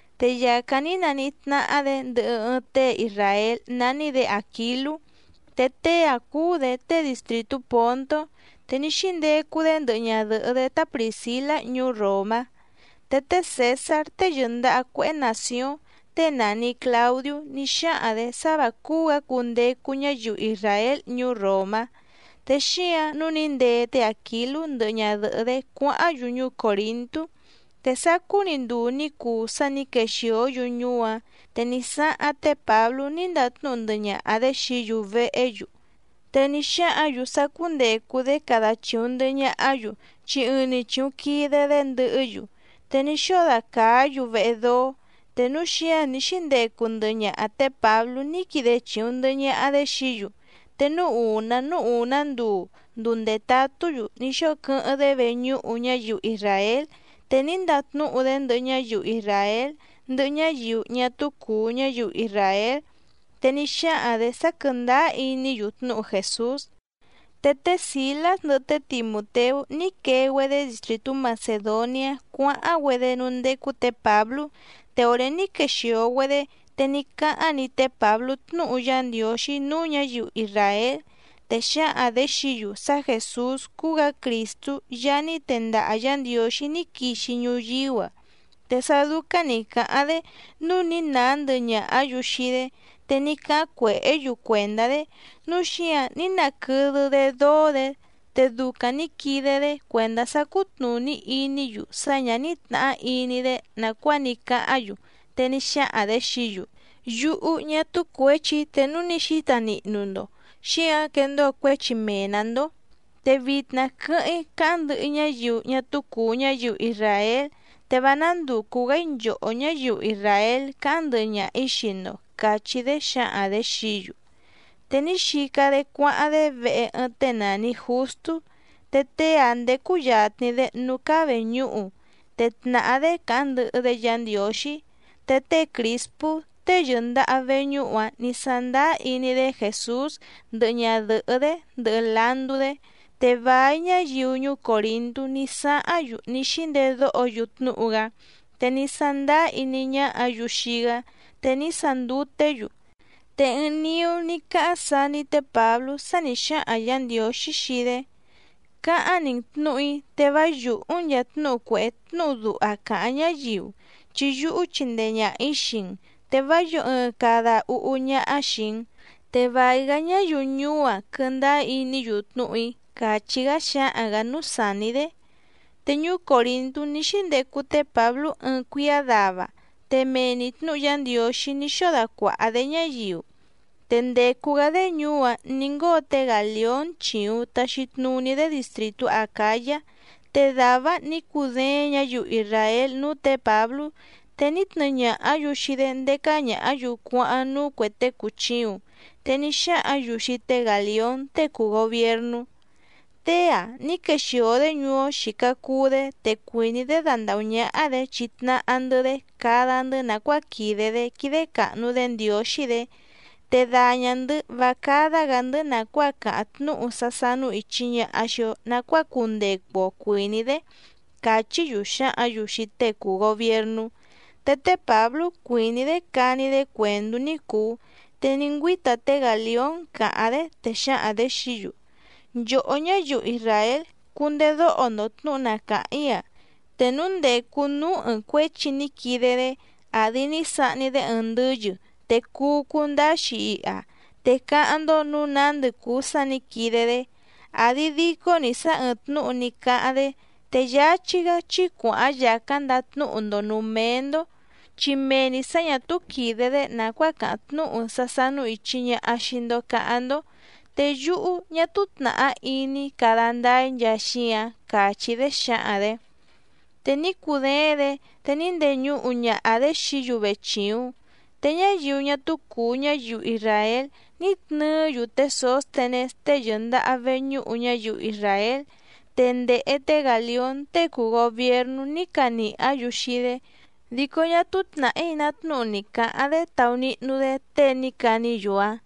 Te yàcáⁿ ní naníhí tnáhá‑dě ndɨhɨ ɨɨⁿ tée isràél nání‑dě Àquilú, te tée‑áⁿ cúú‑dě tée distrìtú Pòntó, te ní xíndecu‑dé ndɨhɨ ñadɨ̀hɨ́‑dé tá Prìscilá ñuú Ròmá. Te té Cèsár tée yɨ̀ndaha cuéhé nàcióⁿ, tée nàni Claudiú ní xáhaⁿ‑dě sá vǎ cúú‑gǎ cundecu ñáyiu isràél ñuú Ròmá, te xíǎⁿ nǔu ní ndee té Àquilú ndɨhɨ ñadɨ̀hɨ́‑dé cuáháⁿ‑yu ñuú Còrintú. Te sácú‑ni nduu ní cuu sá nǐ quexìó‑yu ñuú‑áⁿ, te ní sáháⁿ té Pǎblú ní ndatnúhu ndɨhɨ ñaha‑dě xií‑yu vehé‑yu. Te ní xáhǎⁿ‑yu sá cúndècu‑dé cada chìuⁿ ndɨhɨ ñahá‑yu, chi ɨɨⁿ‑ni chìuⁿ quide‑dé ndɨhɨ́‑yu, te ní xóo dacàá‑yu vehe dóó. Te núu xíǎⁿ ní xíndecu ndɨhɨ ñaha tě Pǎblú ní quide chìuⁿ ndɨhɨ ñaha‑dé xií‑yu. Te núú ùná núú ùná nduu, nduu ndètatú‑yu, ní xóo quɨ́hɨ́ⁿ‑dé veñúhu ñáyiu isràél. Te ní ndatnúhu‑dé ndɨhɨ ñáyiu isràél ndɨhɨ ñáyiu ñá túú cùu ñáyiu isràél, te ní xáhaⁿ‑dě sá quɨ̀ndáá iní‑yu tnúhu Jèsús. Te té Sìlás ndɨhɨ té Timùteú ní quee‑güedé distrìtú Macèdoniá cuáháⁿ‑güedé núú ndécú tě Pǎblú. Te òré ní quexìo‑güedé, te ní cáháⁿ‑ni té Pǎblú tnúhu Yá Ndiǒxí núú ñǎyiu isràél, te xǎhaⁿ‑dě xií‑yu sá Jèsús cúú‑gǎ Crìstú Yaá ní tendaha Yǎ Ndiǒxí ní quixi ñuyíú‑a. Te sá dúcáⁿ nǐ cáháⁿ‑dé nǔu ní nàá ndɨhɨ ñàhá‑yu xii‑dé, te ní cáháⁿ cuèhé‑yu cuèndá‑dé, núu xíǎⁿ ní naquɨdɨ‑dé dóó‑dě. Te ducaⁿ nǐ quide‑dé cuèndá sá cútnùní iní‑yu sá ñǎ ní tnàhá iní‑dé nàcuáa ní cáháⁿ‑yu, te ní xáhaⁿ‑dě xií‑yu: —Yúhú ñá túú cuěchi‑í, te núu ní xíta nihnu‑ndo, xíǎⁿ quèndóo cuéchi mee‑nǎ‑ndó. Te vitna quɨ́hɨ́ⁿ‑í cáháⁿ ndɨhɨ‑í ñáyiu ñá túú cùu ñáyiu isràél, te vá nándùcu‑gá‑í nchòhó ñáyiu isràél cáháⁿ ndɨhɨ ñaha‑ǐ xii‑ndo —càchí‑dé xǎhaⁿ‑dě xií‑yu. Te ní xica‑dé cuáháⁿ‑dé vehe ɨɨⁿ tée nàni Justú, te tée‑áⁿ ndécú yàtni‑dé núú cáá vèñúhu, te tnàhá‑dé càháⁿ ndɨhɨ‑dé Yǎ Ndiǒxí. Te té Crìspú tée yɨ̀ndaha veñúhu‑áⁿ nǐ sándáá iní‑dé Jèsús ndɨhɨ ñadɨ̀hɨ́‑dé ndɨhɨ landú‑dé. Te vài ñáyiu ñuú Còrintú ní sáháⁿ‑yu ní xíndedóho‑yu tnúhu‑gá, te ní sándáá iní ñáhǎ‑yu xii‑gá, te ní sanduté‑yu. Te ɨɨⁿ niú ní cáháⁿ saní té Pǎblú sá nǐ xáhaⁿ Yǎ Ndiǒxí xii‑dé: —Cáháⁿ‑ni‑n tnǔhu‑í, te vá yùhú‑n nchàa tnúhu cuèhé tnúhu duha càháⁿ ñáyiu, chi yúhú chindee ñàha‑í xii‑n, te vá yǒo ɨɨⁿ cada úhú ñáhá xìi‑n, te vài‑gá ñáyiu ñuú‑áⁿ quɨ̀ndáá iní‑yu tnúhu‑í —càchí‑gá xáhaⁿ‑gǎ núú sàní‑dé. Te ñuú Còrintú ní xíndecu té Pǎblú ɨɨⁿ cuíá dava, te mee‑ni tnǔhu Yá Ndiǒxí ní xóo dacuàha‑dé ñáyiu. Te ndècu‑gá‑dé ñuú‑áⁿ nǐ ngóo té Gàlión chìuⁿ taxi tnuní‑dé distrìtú Acǎyá. Te dàvá‑áⁿ nǐ cudééⁿ ñǎyiu isràél núú tě Pǎblú, te ní tnɨɨ ñàhá‑yu xii‑dé ndécá ñàhá‑yu cuáháⁿ núú cuè tée cùchiuⁿ. Te ní xáhǎⁿ‑yu xii té Gàlión tée cùu gobiernú: —Tée‑a ní quexìo‑dé ñuú‑ó xìca cuu‑dé te cuìní‑dé dandàhú ñáhá‑dě chitnahá‑ndɨ́‑dé cada‑ndɨ́ nàcuáa quìde‑dé quídé càhnu‑dé Ndiǒxí‑dě, te daña‑ndɨ̌ vá cádá‑gǎ‑ndɨ́ nàcuáa càháⁿ tnúhu sá sánú ìchi ñaha xii‑o nacuáa cundecu‑o cuìní‑dé —càchí‑yu xǎhǎⁿ‑yu xii tée cùu gobiernú. Te té Pǎblú cuìní‑dé cani‑dé cuèndú ní cùu, te ní ngüíta té Gàlión càháⁿ‑dé, te xǎhaⁿ‑dě xií‑yu: —Nchòhó ñáyiu isràél, cundedóho‑ndo tnǔhu na càháⁿ‑í‑a. Te núu ndècu núú ɨɨⁿ cuéchi ní quide‑dé àdi ní sahni‑dé ɨɨⁿ ndɨ́yɨ, te cuu cundáá‑xi iha, te cáháⁿ‑ndó nǔu nándɨ cùu sá nǐ quide‑dé, àdi dico‑ni sá ɨ́ɨ́ⁿ tnǔhu ní cáháⁿ‑dé, te yáchí‑gá chí cuàháⁿ yàcáⁿ ndatnúhu‑ndo nǔú méé‑ndó, chi mee‑ni sǎ ñà túú quìde‑dé nàcuáa càháⁿ tnúhu sá sánú ìchi ñaha xii‑ndo caháⁿ‑ndó, te yúhú ñá túú tnàhá iní‑í cada ndáá‑í nchaa xíǎⁿ —càchí‑dé xǎhaⁿ‑dě. Te ní cudééⁿ‑dě, te ní ndeñuhu ñaha‑dě xií‑yu vechìuⁿ. Te ñáyiu ñá túú cùu ñáyiu isràél ní tnɨɨ́‑yu té Sǒstenés tée yɨ̀ndaha veñúhu ñáyiu isràél, te ndèhe té Gàlión tée cùu gobiernú ní canìhá‑yu xii‑dé, dico ñá túú tnàhí ná tnúhu ni cǎháⁿ‑dé taunihnu‑dé tée ní caní‑yu‑áⁿ.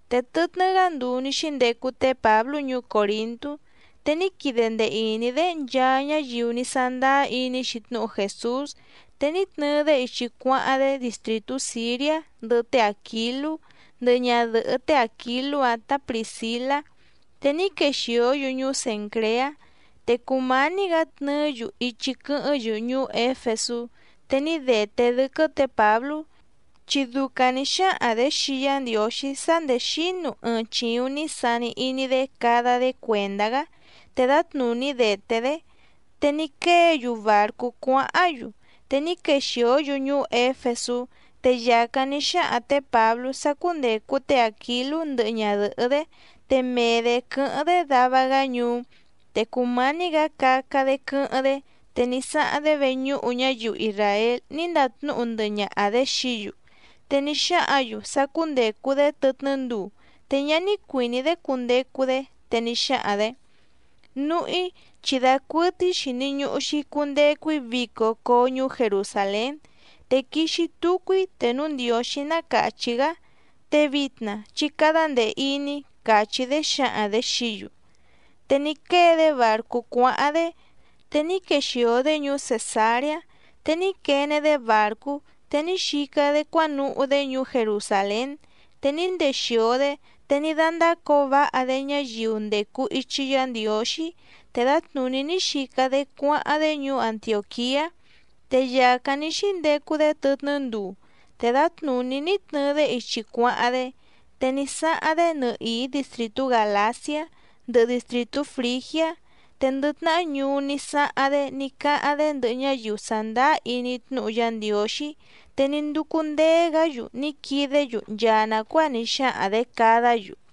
Te tɨtnɨ́‑gá nduu ní xíndecu té Pǎblú ñuú Còrintú, te ní quide ndee ìní‑dé nchaa ñáyiu ní sándáá iní‑xi tnúhu Jèsús, te ní tnɨɨ‑dé ichi cuáháⁿ‑dé distrìtú Sìriá ndɨhɨ té Àquilú ndɨhɨ ñadɨ̀hɨ́ té Àquilú‑áⁿ tǎ Prìscilá, te ní quexìó‑yu ñuú Cèncreá. Te cùmání‑gǎ tnɨɨ́‑yu ichi quɨ́hɨ́ⁿ‑yu ñuú Éfesú, te ní dèté dɨ́quɨ́ tě Pǎblú, chi ducaⁿ nǐ xáhaⁿ‑dě xii Yá Ndiǒxí sá nděé xínu ɨɨⁿ chìuⁿ ní sani iní‑dé cada‑dé cuèndá‑gá, te dǎtnùní dèté‑dé. Te ní quée‑yu bàrcú cuáháⁿ‑yu. Te ní quexìó‑yu ñuú Éfesú, te yàcáⁿ ní xáhaⁿ tě Pǎblú sá cúndècu té Àquilú ndɨhɨ ñadɨ̀hɨ́‑dé, te mee‑dě quɨ́hɨ́ⁿ‑dé dava‑gá ñuú. Te cùmání‑gǎ caca‑dé quɨ́hɨ́ⁿ‑dé, te ní sáháⁿ‑dé veñúhu ñáyiu isràél ní ndatnúhu ndɨhɨ ñaha‑dě xií‑yu. Te ní xáhǎⁿ‑yu sá cúndècu‑dé tɨtnɨ́ nduu, te ñá ní cuìní‑dé cundecu‑dé. Te ní xáhaⁿ‑dě: —Núhú‑í chi dacuɨtɨ́í xìni ñuhu‑xi cundecu‑í vico coo ñuú Jerusàlén, te quixi tucu‑í te núu Ndiǒxí ná càchí‑gá, te vitna chí cádá ndèe iní —càchí‑dé xǎhaⁿ‑dě xií‑yu. Te ní quée‑dé bàrcú cuáháⁿ‑dé. Te ní quexìo‑dé ñuú Cèsareá, te ní quene‑dé bàrcú, te ní xica‑dé cuánuhú‑dé ñuú Jerusàlén, te ní ndexìo‑dé, te ní dándácǒo váha‑dé ñáyiu ndècu ichi Yá Ndiǒxí, te dǎtnùní ní xica‑dé cuáháⁿ‑dé ñuú Antiòquiá. Te yàcáⁿ ní xíndecu‑dé tɨtnɨ́ nduu, te dǎtnùní ní tnɨɨ‑dé ichi cuáháⁿ‑dé. Te ní sáháⁿ‑dé nɨhìí distrìtú Gàlaciá ndɨhɨ distrìtú Frìgiá. Te ndɨ tnahá ñuú ní sáháⁿ‑dé ní cáháⁿ‑dé ndɨhɨ ñáyiu sàndáá iní tnúhu Yá Ndiǒxí, te ní ndúcú ndéé‑gǎ‑yu ní quidé‑yu nchaa nàcuáa ní xáhaⁿ‑dě cadá‑yu.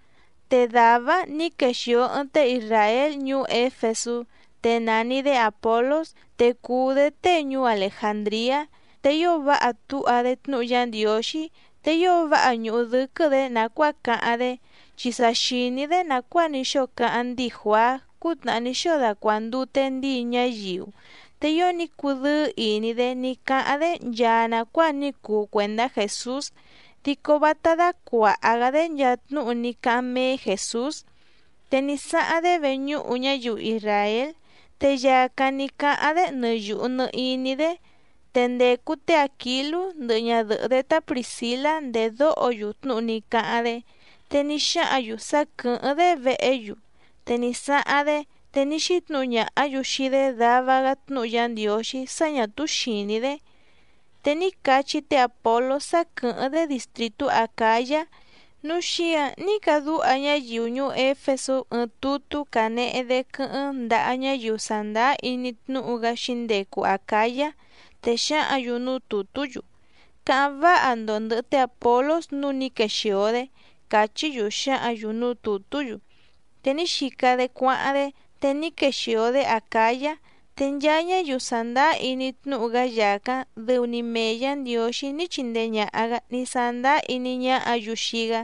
Te dàvá‑áⁿ nǐ quèxio ɨɨⁿ tée isràél ñuú Éfesú, te nàni‑dé Àpolós, te cùu‑dé tée ñuú Alejàndriá, te ío váha túha‑dé tnúhu Yá Ndiǒxí, te ío váha ñùhu dɨ́quɨ́‑dě nàcuáa cáháⁿ‑dé, chi sa xìní‑dé nàcuáa ní xóo cáháⁿ ndíi Juàá cútnàhá ní xóo dacuàndute ndíi ñáyiu. Te ío ní cudɨ́ɨ́ ìní‑dé ní cáháⁿ‑dé nchaa nàcuáa ní cuu cuèndá Jèsús, dico vátá dácuàha‑gá‑dé nchaa tnúhu ní cáháⁿ méé Jèsús. Te ní sáháⁿ‑dé veñúhu ñáyiu isràél, te yàcáⁿ ní cáháⁿ‑dé nɨ yùhu nɨ iní‑dé. Te ndècu té Àquilú ndɨhɨ ñadɨ̀hɨ́‑dé tá Prìscilá ndèdóho‑yu tnúhu ní cáháⁿ‑dé, te ní xáhǎⁿ‑yu sá quɨ̀hɨ́ⁿ‑dé vehé‑yu, te ní sáháⁿ‑dé, te ní xítnǔhu ñàhá‑yu xii‑dé dava‑gá tnúhu Yá Ndiǒxí sá ñà túú xìní‑dé. Te ní cachí té Àpolós sá quɨ̀hɨ́ⁿ‑dé distrìtú Acǎyá, núu xíǎⁿ ní cadúha ñáyiu ñuú Éfesú ɨɨⁿ tutú canehe‑dé quɨ́hɨ́ⁿ ndaha ñáyiu sàndáá iní tnúhu‑gá xǐndecu Acǎyá. Te xǎhǎⁿ‑yu núú tùtú‑yu: “Cáháⁿ váha‑ndo ndɨ̀hɨ té Àpolós nǔu ní quexìo‑dé”, càchí‑yu xǎhǎⁿ‑yu núú tùtú‑yu. Te ní xica‑dé cuáháⁿ‑dé, te ní quexìo‑dé Acǎyá. Te nchaa ñáyiu sàndáá iní tnúhu‑gá yàcáⁿ, dɨu‑ni mee Yǎ Ndiǒxí ní chindee ñàha‑gá ní sándáá iní ñáhǎ‑yu xii‑gá.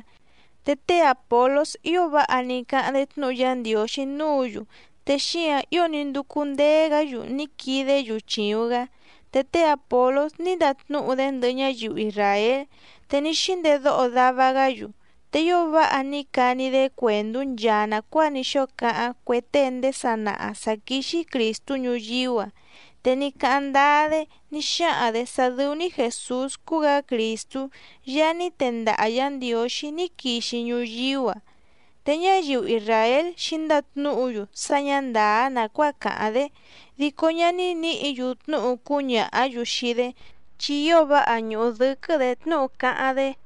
Te té Àpolós ío váha ní cáháⁿ‑dé tnúhu Yá Ndiǒxí núǔ‑yu, te xíǎⁿ ío ní ndúcú ndéé‑gǎ‑yu ní quidé‑yu chìuⁿ‑gá. Te té Àpolós ní ndatnúhu‑dé ndɨhɨ ñáyiu isràél, te ní xíndedóho dava‑gá‑yu. Te ío váha ní cani‑dé cuèndú nchaa nàcuáa ní xóo cáháⁿ cue tée ndéé sanaha sǎ quíxí Crìstú ñuyíú‑a. Te ní cáháⁿ ndáá‑dé ní xáhaⁿ‑dě sá dɨ́ú‑ní Jèsús cúú‑gǎ Crìstú Yaá ní tendaha Yǎ Ndiǒxí ní quixi ñuyíú‑a. Te ñáyiu isràél xǐndatnúhu‑yu sá ñǎ ndàá nàcuáa càháⁿ‑dé, dico ñá ní nǐhǐ‑yu tnúhu cúñàhá‑yu xii‑dé, chi ío váha ñùhu dɨ́quɨ́‑dě tnúhu cáháⁿ‑dé.